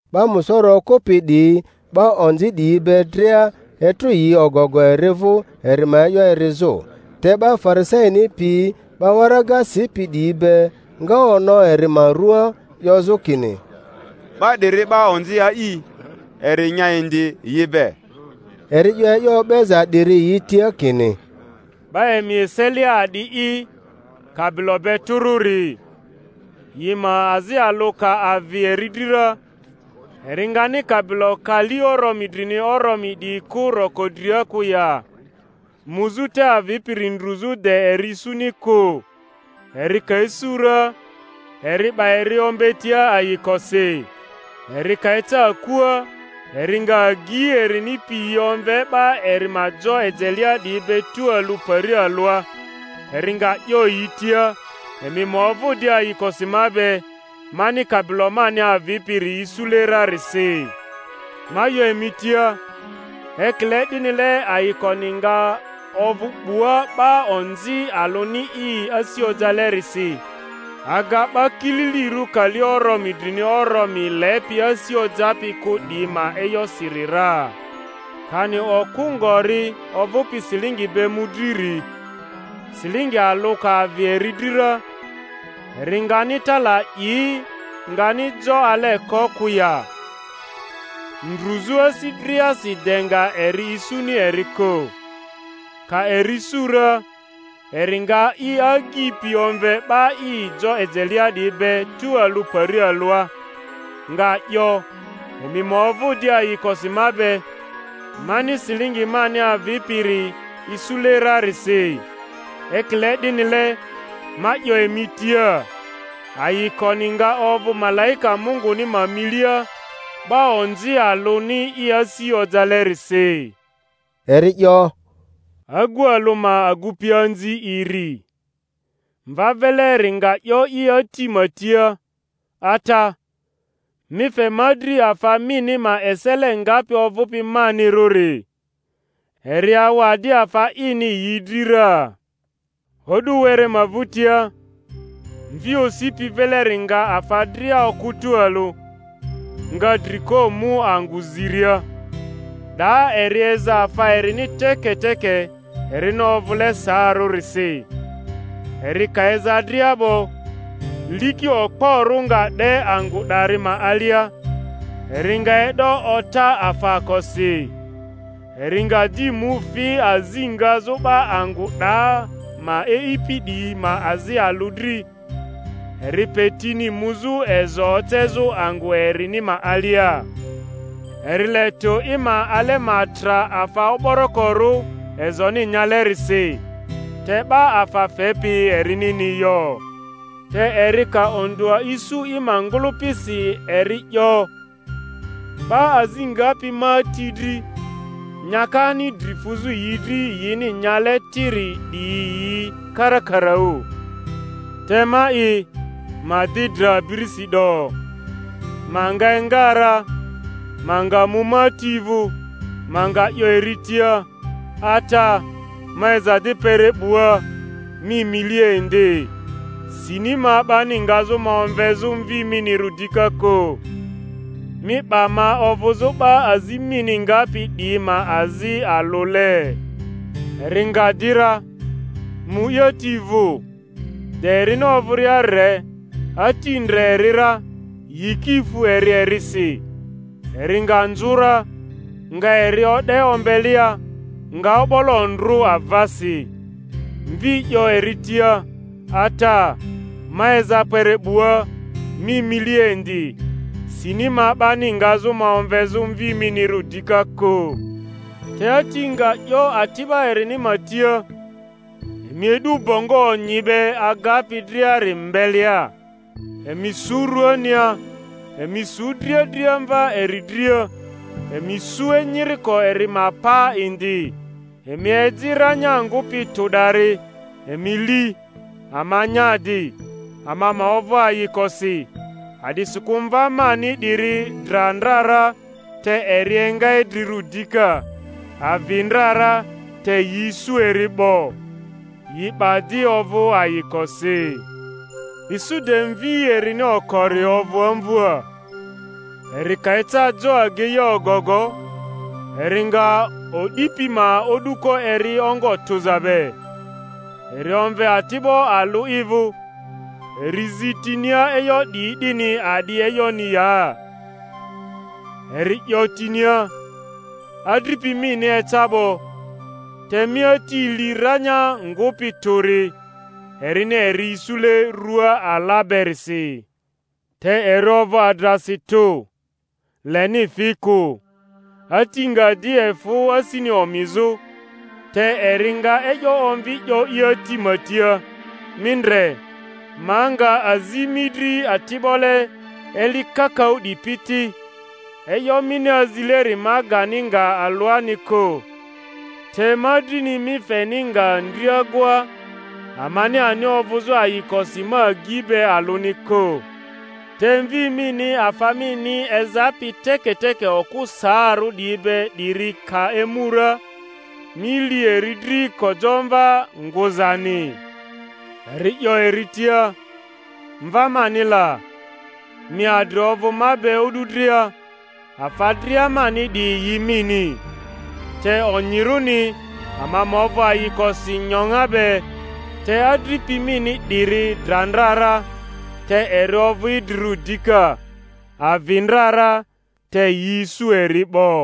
'Ba musoro okᴜpi 'diyi 'ba onzi 'diyi be dria, etrᴜ yi ogogo eri vᴜ eri ma e'yo erizᴜ. Te 'ba Farisaini piyi 'ba waraga sipi 'diyi be nga ono eri ma ruaa 'yozᴜ kini, 'Ba 'diri 'ba onzi a'i, eri nya indi yi be. Eri 'yo e'yo o'beza 'diri yi tia, kini, 'Ba emi eselia a'di'i kabilo be tᴜrᴜri, yi ma azi alᴜ ka avi eri dri ra, eri ngani kabilo kali oromi drini oromi 'diyi kᴜ roko dria kᴜ ya, muzᴜ te avipiri ndruzᴜ de eri isuni kᴜ? Eri ka isu ra, eri 'ba eri ombetia ayikosi. Eri ka eca akua, eri nga agyi erini piyi omve 'ba eri ma jo ejelea 'diyi be tualᴜ pari alᴜa, eri nga 'yo yi tia, Emi ma ovᴜ di ayikosi ma be, mani kabilo mani avipiri isule rarisi. Ma 'yo emi tia, ekile 'dinile ayikoni nga ovᴜ 'bua 'ba onzi alᴜni i asi ojalerisi aga 'ba kililirᴜ kali oromi drini oromi lepi asi ojapi kᴜ 'diyi ma e'yosiri ra. Kani okᴜ ngori ovᴜpi silingi be mᴜdriri, silingi alᴜ ka avi eri dri ra, eri ngani tala 'i, ngani jo ale ko kᴜ ya, ndruzᴜ asi driasi de nga eri isuni eri kᴜ? Ka eri isu ra, eri nga i agyi pi omve 'ba i jo ejelea 'diyi be tualᴜ pari alᴜa, nga 'yo, Emi ma ovᴜ di ayikosi ma be, mani silingi mani avipiri isule rarisi. Ekile 'dinile, ma 'yo emi tia. ayikoni nga ovᴜ malaika Munguni ma milia 'ba onzi alᴜni i asi ojalerisi. Eri 'yo, Agu alᴜ ma agupianzi iri; mva vileri nga 'yo i ati ma tia, Ata, mi fe ma dri afa mini ma esele ngapi ovᴜpi manirᴜri. Eri awa di afa ini yi dri ra. O'du were ma vᴜtia, mvi osipi vileri nga afa dria okᴜ tualᴜ, nga dri ko mu angᴜ ziria; 'daa eri eza afa erini teketeke erini ovᴜle saarᴜrisi. Eri ka eza dria 'bo, liki okporᴜ nga 'de angᴜ 'dari ma alia; eri nga e'do ota afaakosi. Eri nga di mu fi azi ngazᴜ 'ba angᴜ 'da ma e'ipi 'diyi ma azi alᴜ dri; eri pe tini muzᴜ ezo ocezᴜ angᴜ erini ma alia. Eri le tᴜ i ma ale ma tra afa o'borokorᴜ ezoni nyalerisi; te 'ba afa fepi erinini yo. Te eri ka ondᴜa isu i ma ngᴜlᴜpisi eri 'yo, 'Ba azi ngapi ma ati dri, nyakani dri fuzᴜ yi dri yini nyale tiri 'diyi yi karakaraᴜ, te ma'i, ma di dra abirisi 'do! Ma nga enga ra, ma nga mu ma ati vᴜ, ma nga 'yo eri tia, Ata, ma eza di kpere 'bua, mi milia indi; sini ma 'bani ngazᴜ ma omvezᴜ mvi minirᴜ dika kᴜ; mi 'ba ma ovᴜzᴜ 'ba azi mini ngapi 'diyi ma azi alᴜle. Eri nga di ra, mu i ati vᴜ. De erini ovᴜria re, ati ndre eri ra, yiki fu eri erisi, eri nga nzᴜ ra, nga eri o'de ombelea, nga o'bolo ndrᴜ avasi. Mvi 'yo eri tia, Ata, ma eza kpere 'bua, mi milia indi; sini ma 'bani ngazᴜ ma omvezᴜ mvi minirᴜ dika kᴜ. Te ati nga 'yo ati'ba erini ma tia, Emi e'du bongo onyi be agapi driari mbelea, emi su ruania; emi su driadriamva eri dria, emi su enyiriko eri ma paa indi; emi eji ranyaa ngᴜpi tᴜ 'dari, emi li, ama nya di, ama ma ovᴜ ayikosi; a'disikᴜ mva mani 'diri dra ndra ra, te eri enga idrirᴜ dika; avi ndra ra, te yi isu eri 'bo. Yi 'ba di ovᴜ ayikosi. Isu de mvi erini okori ovᴜ amvᴜa; eri ka eca jo ageia ogogo, eri nga o'di pi ma o'duko eri ongo tᴜza be. Eri omve ati'bo alᴜ i vᴜ, eri zi tinia e'yo 'diyi 'dini a'di e'yoni ya. Eri 'yo tinia, Adripi mini eca 'bo; te mi ati li ranya ngᴜpi tᴜri, erini eri isule rua ala berisi. Te eri ovᴜ adrasi tᴜ, leni fi kᴜ. Ati nga di efᴜ asini omizᴜ, te eri nga e'yo omvi 'yo i ati ma tia, Mi ndre, ma nga azi mi dri ati'bole eli kakaᴜ 'dipi ti, e'yo mini azileri ma gani nga alᴜani kᴜ; te ma drini mi feni nga ndriagoa, amani ani ovᴜzᴜ ayikosi ma agyi be alᴜni kᴜ. Te mvi mini afa mini ezapi teketeke okᴜ saarᴜ 'diyi be 'diri ka emu ra, mi li eri dri kojamva ngᴜzani! Eri 'yo eri tia, Mva mani la! mi adri ovᴜ ma be o'du dria, afa dria mani 'diyi yi mini. Te onyirᴜni ama ma ovᴜ ayikosi nyoŋa be, te adripi mini 'diri dra ndra ra, te eri ovᴜ idrirᴜ dika; avi ndra ra, te yi isu eri 'bo.